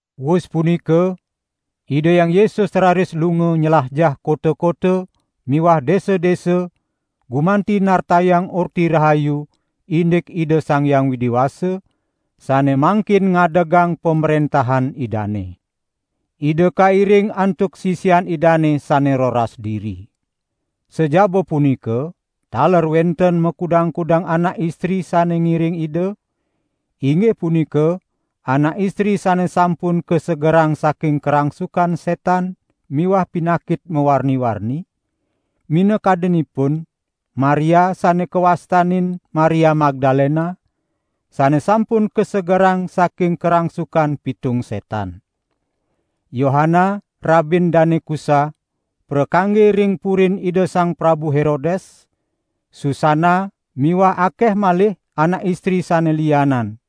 Wus punika Ida Hyang Yesus raris lunga nylajah kota-kota miwah desa-desa gumanti nartayang Orti Rahayu indik Ida Sang Hyang Widi Wasa sane mangkin ngadegang Pamrentahan Idane. Ida kairing antuk sisian Idane sane roras diri. Sajaba punika taler wenten makudang-kudang anak istri sane ngiring Ida, inggih punika anak istri sane sampun kasegerang saking karangsukan setan miwah pinakit mawarni-warni, minakadinipun Maria sane kawastanin Maria Magdalena, sane sampun kasegerang saking karangsukan pitung setan. Yohana rabin Dane Kusa prakangge ring purin Ida Sang Prabu Herodes, Susana miwah akeh malih anak istri sane lianan.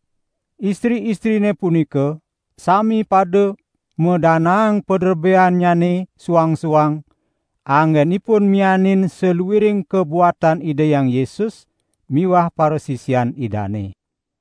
Istri-istrine punika sami pada madanaang paderbeannyane suang-suang anggenipun mianin saluiring kabuatan Ida Hyang Yesus miwah parasisian Idane.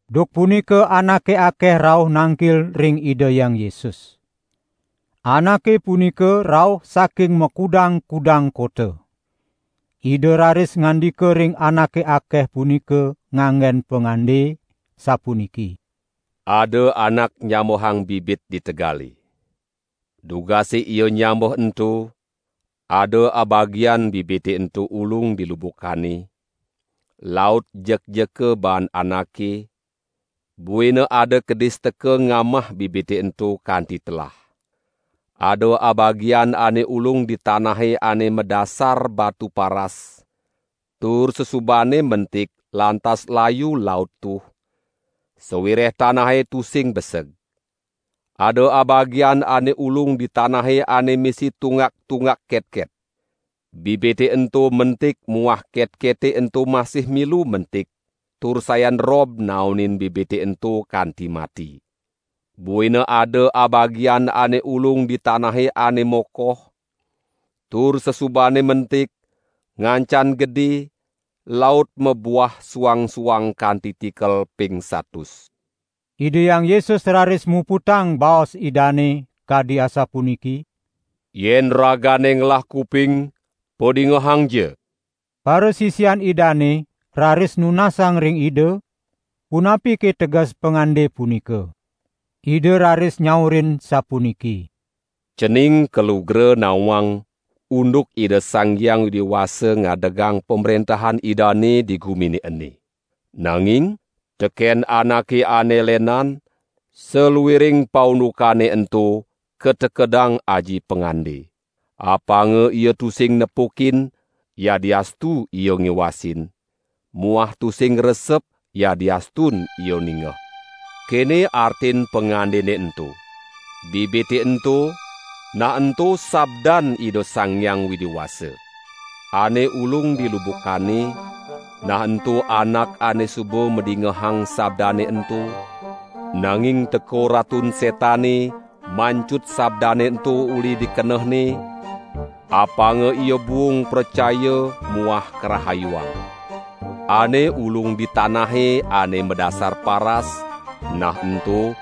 Duk punika anake akeh rauh nangkil ring Ida Hyang Yesus. Anake punika rauh saking makudang-kudang kota. Ida raris ngandika ring anake akeh punika nganggen pangande, sapuniki: "Ada anak nyambehang bibit di tegale. Dugase ia nyambeh ento, ada abagian bibite ento ulung di lubukane, laut jekjeka baan anake, buina ada kedis teka ngamah bibite ento kanti telah. Ada abagian ane ulung di tanahe ane madasar batu paras, tur sasubane mentik lantas layu laut tuh, sawireh tanahe tusing beseg. Ada abagian ane ulung di tanahe ane misi tunggak-tunggak ketket. Bibite ento mentik muah ketkete ento masih milu mentik tur sayan rob naonin bibite ento kanti mati. Buina ada abagian ane ulung di tanahe ane mokoh, tur sasubane mentik, ngancan gede, laut mabuah suang-suang kanti tikel ping satus." Ida Hyang Yesus raris muputang baos Idane, kadi sapuniki: "Yen ragane ngelah kuping padingehangja!" Parasisian Idane raris nunasang ring Ida, punapike teges pangande punika. Ida raris nyaurin sapuniki: "Cening kalugra nawang unduk Ida Sang Hyang Widi Wasa ngadegang Pamrentahan Idane di gumine ene. Nanging teken anake ane lenan, saluiring paundukane ento katekedang aji pangande. Apanga ia tusing nepukin yadiastu ia ngiwasin muah tusing ngresep yadiastun ia ningeh." "Kene artin pangandene ento: Bibite ento, nah ento sabdan Ida Sang Hyang Widi Wasa. Ane ulung di lubukane, nah ento anak ane suba madingehang sabdane ento, nanging teka Ratun Setane mancut sabdane ento uli di kenehne, apanga ia buung pracaya muah karahayuang. Ane ulung di tanahe ane madasar paras, nah ento,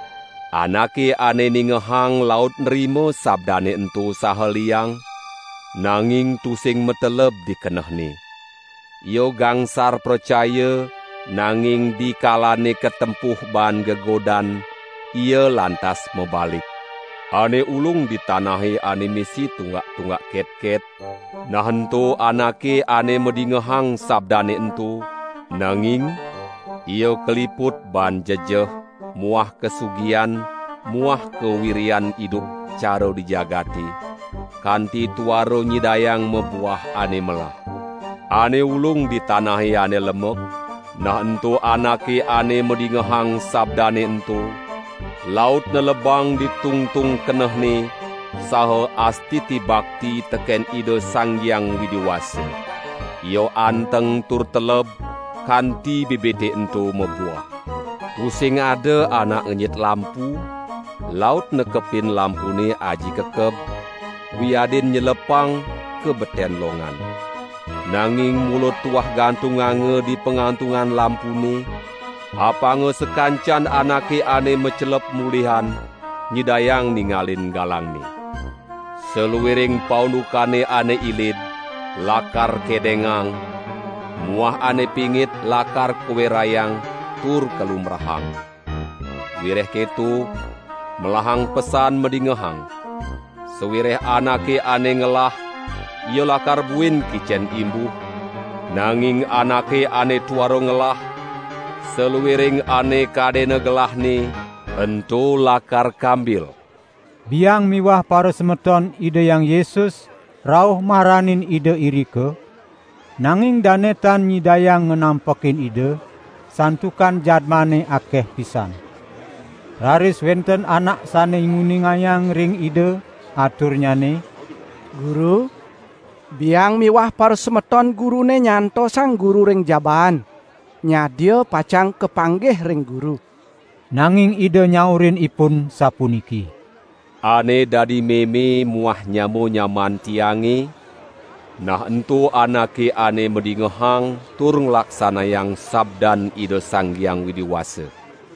anake ane ningehang laut nrima sabdane ento saha liang, nanging tusing mateleb di kenehne. Ia gangsar pracaya, nanging dikalane katempuh baan gegodan, ia lantas mabalik. Ane ulung di tanahe ane misi tunggak-tunggak ketket, nah ento anake ane madingehang sabdane ento, nanging ia kaliput baan jejeh muah kasugihan muah kawiryan idup cara di jagate, kanti tuara nyidayang mabuah ane melah. Ane ulung di tanahe ane lemek, nah ento anake ane madingehang sabdane ento, laut nelebang di tungtung kenehne saha astiti bakti teken Ida Sang Hyang Widi Wasa. Ia anteng tur teleb, kanti bibite ento mabuah." "Tusing ada anak ngenyit lampu laut nekepin lampune aji kekeb, wiadin nyelepang ka beten longan. Nanging mula tuah gantunganga di pangantungan lampune, apanga sakancan anake ane macelep mulihan, nyidayang ningalin galangne. Saluiring paundukane ane ilid lakar kedengang muah ane pingit lakar kawerayang tur kalumbrahang. Wireh keto, melahang pesan madingehang. Sawireh anake ane ngelah, ia lakar buin kicen imbuh, nanging anake ane tuara ngelah, saluiring ane kadena gelahne, ento lakar kambil." Biang miwah parasemeton Ida Hyang Yesus rauh maranin Ida irika, nanging dane tan nyidayang nganampekin Ida, santukan jadmane akeh pisan. Raris wenten anak sane nguningayang ring Ida, aturnyane: "Guru, biang miwah parasemeton Gurune nyantosang Guru ring jabaan, nyadia pacang kapanggih ring Guru." Nanging Ida nyaurin ipun sapuniki: "Ane dadi meme muah nyama-nyamaan Tiange, nah ento anake ane madingehang tur nglaksanayang sabdan Ida Sang Hyang Widi Wasa."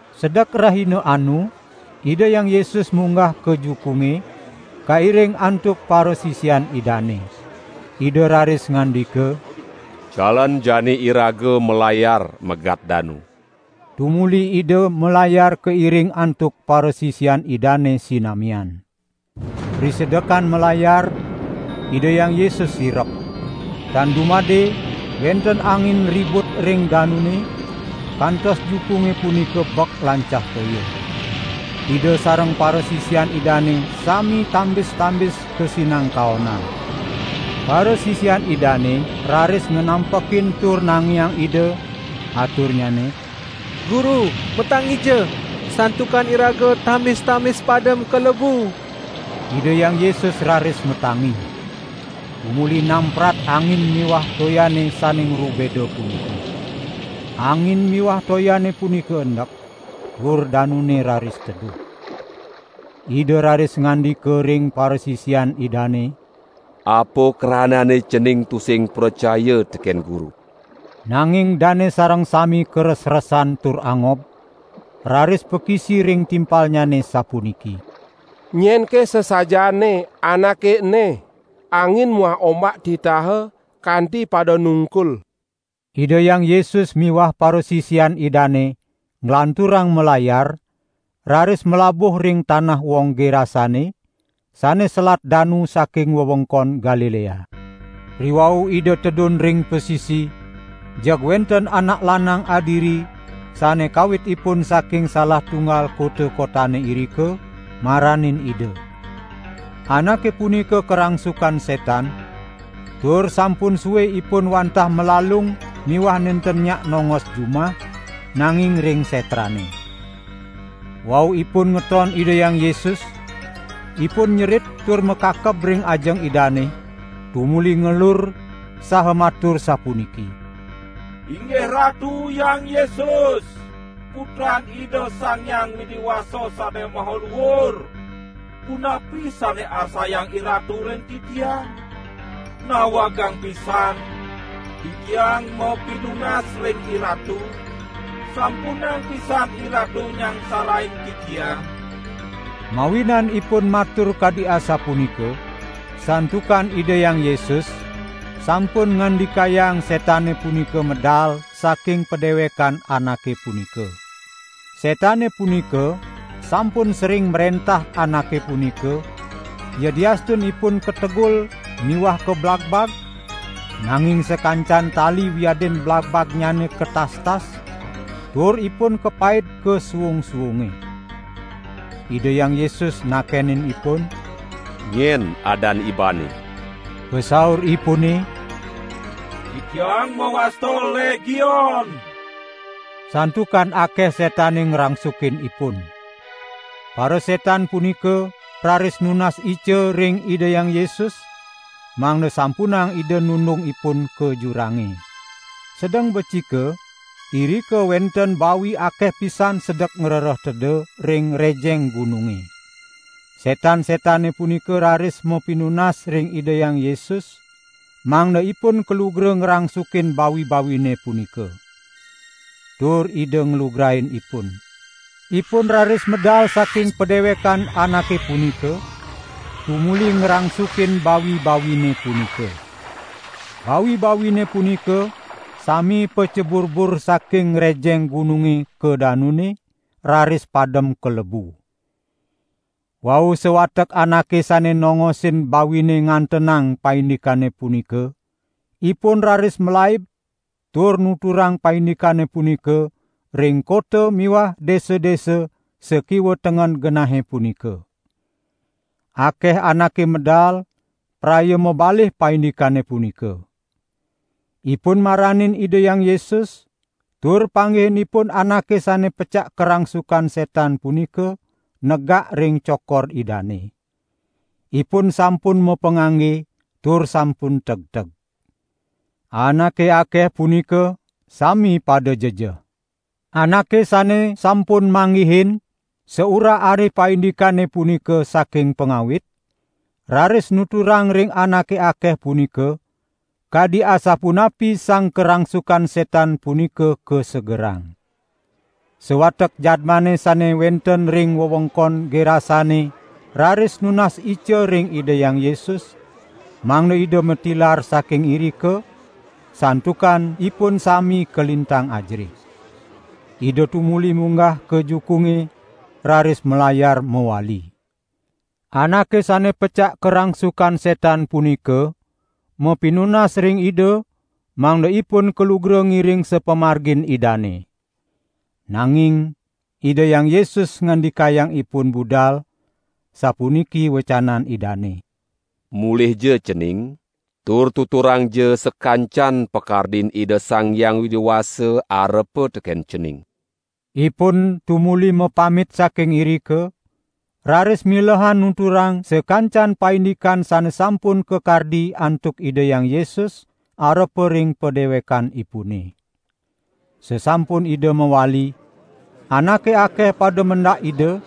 Sedek rahina anu Ida Hyang Yesus munggah ka jukunge, kairing antuk parasisian Idane. Ida raris ngandika: "Jalan jani iraga malayar megat danu." Tumuli Ida malayar kairing antuk parasisian Idane sinamian. Risedekan malayar, Ida Hyang Yesus sirep. Tan dumade wenten angin ribut ring danune, kantos jukunge punika bek lancah toya. Ida sareng parasisian Idane sami tambis-tambis kasinangkaonan. Parasisian Idane raris nganampekin tur nangiang Ida, aturnyane: "Guru matangija! Santukan iraga tambis-tambis padem kalebu!" Ida Hyang Yesus raris matangi, tumuli namprat angin miwah toyane sane ngrubeda punika. Angin miwah toyane punika endek, tur danune raris teduh. Ida raris ngandika ring parasisian Idane: "Apa kranane cening tusing pracaya teken Guru?" Nanging dane sareng sami karesresan tur angob, raris pakisi ring timpalnyane sapuniki: "Nyenke sasajaane Anake ene? Angin muah ombak titaha, kanti pada nungkul." Ida Hyang Yesus miwah parasisian Idane nglanturang malayar, raris malabuh ring tanah wong Gerasane, sane selat danu saking wewengkon Galilea. Riwau Ida tedun ring pasisi jeg wenten anak lanang adiri sane kawitipun saking salah tunggal kota-kotane irika, maranin Ida. Anake punika karangsukan setan, tur sampun sue ipun wantah malalung miwah nenten nyak nongos jumah, nanging ring setrane. Wau ipun ngeton Ida Hyang Yesus, ipun nyerit tur makakeb ring ajeng Idane, tumuli ngelur saha matur sapuniki: "Inggih Ratu Hyang Yesus, Putran Ida Sang Hyang Widi Wasa Sane Maha Luur! Punapi sane arsayang IRatu ring titiang? Nawegang pisan, titiang mapinunas ring IRatu, sampunang pisan IRatu nyangsarain titiang!" Mawinan ipun matur kadi asapunika, santukan Ida Hyang Yesus sampun ngandikayang setane punika medal saking padewekan anake punika. Setane punika sampun sering mrentah anake punika yadiastun ipun kategul miwah kablagbag, nanging sakancan tali wiadin blagbagnyane katastas, tur ipun kapaid ka suung-suunge. Ida Hyang Yesus nakenin ipun: "Nyen adan ibane?" Pasauripune: "Titiang mawasta Legion," santukan akeh setane ngrangsukin ipun. Parasetan punika raris nunas ica ring Ida Hyang Yesus, mangda sampunang Ida nundung ipun ka jurange. Sedeng becike irika wenten bawi akeh pisan sedek ngrereh teda ring rejeng gununge. Setan-setane punika raris mapinunas ring Ida Hyang Yesus, mangda ipun kalugra ngrangsukin bawi-bawine punika. Tur Ida nglugrain ipun. Ipun raris medal saking padewekan anake punika, tumuli ngrangsukin bawi-bawine punika. Bawi-bawine punika sami paceburbur saking rejeng gununge ka danune, raris padem kalebu. Wau sawatek anake sane nongosin bawine ngantenang paindikane punika, ipun raris malaib tur nuturang paindikane punika ring kota miwah desa-desa sakiwa tengen genahe punika. Akeh anake medal praya mabalih paindikane punika. Ipun maranin Ida Hyang Yesus, tur panggihin ipun anake sane pecak karangsukan setan punika negak ring cokor Idane. Ipun sampun mapangangge tur sampun tegteg. Anake akeh punika sami pada jejeh. Anake sane sampun manggihin saurah-arih paindikane punika saking pangawit, raris nuturang ring anake akeh punika, kadi asapunapi sang karangsukan setan punika kasegerang. Sawatek jadmane sane wenten ring wewengkon Gerasane raris nunas ica ring Ida Hyang Yesus, mangda Ida matilar saking irika, santukan ipun sami kalintang ajerih. Ida tumuli munggah ka jukunge, raris malayar mawali. Anake sane pecak karangsukan setan punika mapinunas ring Ida mangda ipun kalugra ngiring sapamargin Idane. Nanging Ida Hyang Yesus ngandikayang ipun budal, sapuniki wecanan Idane: "Mulihja cening, tur tuturangja sakancan pakardin Ida Sang Hyang Widi Wasa arepa teken cening!" Ipun tumuli mapamit saking irika, raris milehan nuturang sakancan paindikan sane sampun kakardi antuk Ida Hyang Yesus arepa ring padewekanipune. Sasampun Ida mawali, anake akeh pada mendak Ida,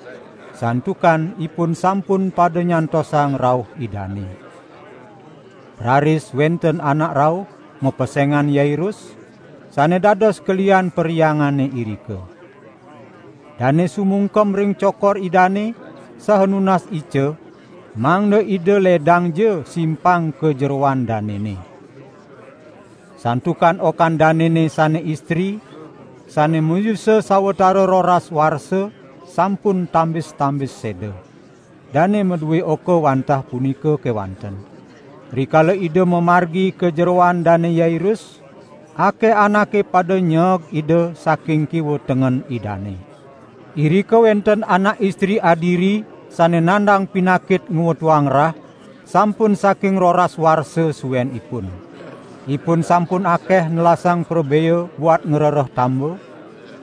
santukan ipun sampun pada nyantosang rauh Idane. Raris wenten anak rauh, mapesengan Yairus, sane dados kelihan perhyangane irika. Dane sumungkem ring cokor Idane, saha nunas ica, mangda Ida ledangja simpang ka jeroan danene. Santukan okan danene sane istri, sane mayusa sawatara roras warsa, sampun tambis-tambis seda. Dane madue oka wantah punika kewanten. Rikala Ida mamargi ka jeroan Dane Yairus, akeh anake pada nyeeg Ida saking kiwa tengen Idane. Irika wenten anak istri adiri sane nandang pinakit ngwetuang rah sampun saking roras warsa suenipun. Ipun sampun akeh nelasang prabea buat ngrereh tamba,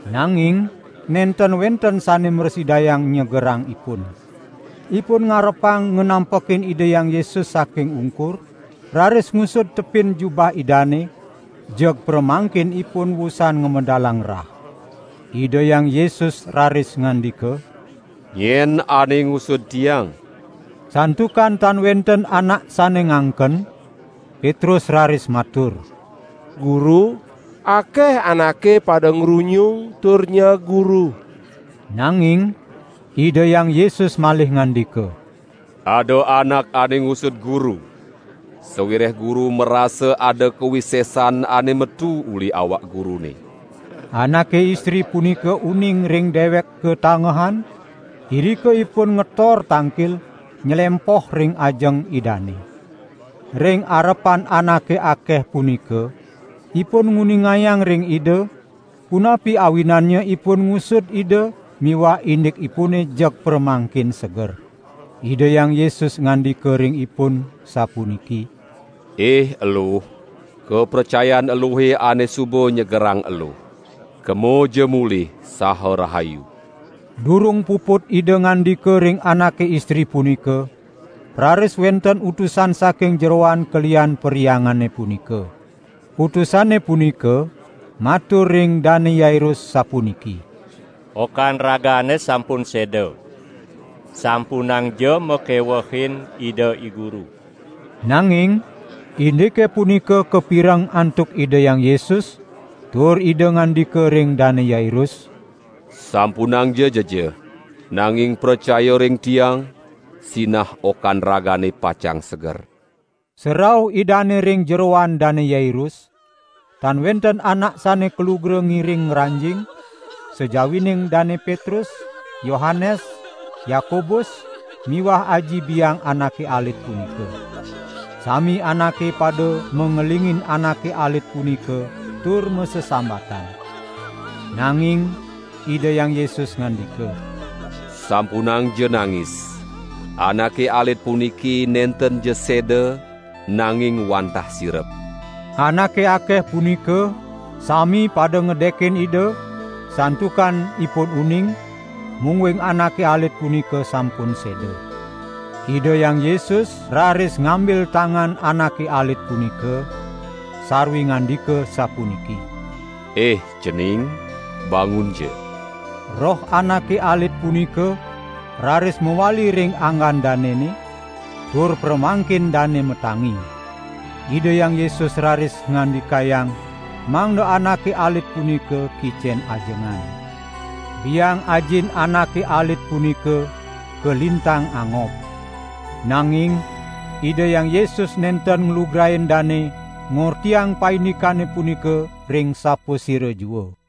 nanging nenten wenten sane mrasidayang nyegerang ipun. Ipun ngarepang nganampekin Ida Hyang Yesus saking ungkur, raris ngusud tepin jubah Idane, jeg pramangkin ipun wusan ngamedalang rah. Ida Hyang Yesus raris ngandika: "Nyen ane ngusud Tiang?" Santukan tan wenten anak sane nganken, Petrus raris matur: "Guru, akeh anake pada ngrunyung tur nyeeg Guru." Nanging Ida Hyang Yesus malih ngandika: "Ada anak ane ngusud Guru, sawireh Guru marasa ada kawisesan ane metu uli awak Gurune." Anake istri punika uning ring dewek katangehan, irika ipun ngetor tangkil, nylempoh ring ajeng Idane. Ring arepan anake akeh punika ipun nguningayang ring Ida, punapi awinannya ipun ngusud Ida miwah indikipune jeg pramangkin seger. Ida Hyang Yesus ngandika ring ipun, sapuniki: "Ih eluh, kapracayan eluhe ane suba nyegerang eluh. Kemaja mulih saha rahayu." Durung puput Ida ngandika ring anake istri punika, raris wenten utusan saking jeroan kelihan perhyangane punika. Utusane punika matur ring Dane Yairus sapuniki: "Okan ragane sampun seda. Sampunangja makewehin Ida I Guru!" Nanging indike punika kapireng antuk Ida Hyang Yesus, tur Ida ngandika ring Dane Yairus: "Sampunangja jejeh, nanging pracayaja ring Tiang, sinah okan ragane pacang seger." Sarauh Idane ring jeroan Dane Yairus, tan wenten anak sane kalugra ngiring ngranjing, sajawining Dane Petrus, Yohanes, Yakobus miwah aji biang anake alit punika. Sami anake pada mangelingin anake alit punika tur masesambatan. Nanging Ida Hyang Yesus ngandika: "Sampunangja nangis! Anake alit puniki nentenja seda, nanging wantah sirep." Anake akeh punika sami pada ngedekin Ida, santukan ipun uning, mungguing anake alit punika sampun seda. Ida Hyang Yesus raris ngambil tangan anake alit punika sarwi ngandika sapuniki: "Ih cening bangunja!" Roh anake alit punika raris mawali ring anggan danene, tur pramangkin dane matangi. Ida Hyang Yesus raris ngandikayang mangda anake alit punika kicen ajengan. Biang ajin anake alit punika kalintang angob. Nanging Ida Hyang Yesus nenten nglugrain dane ngortiang paindikane punika ring sapasira jua.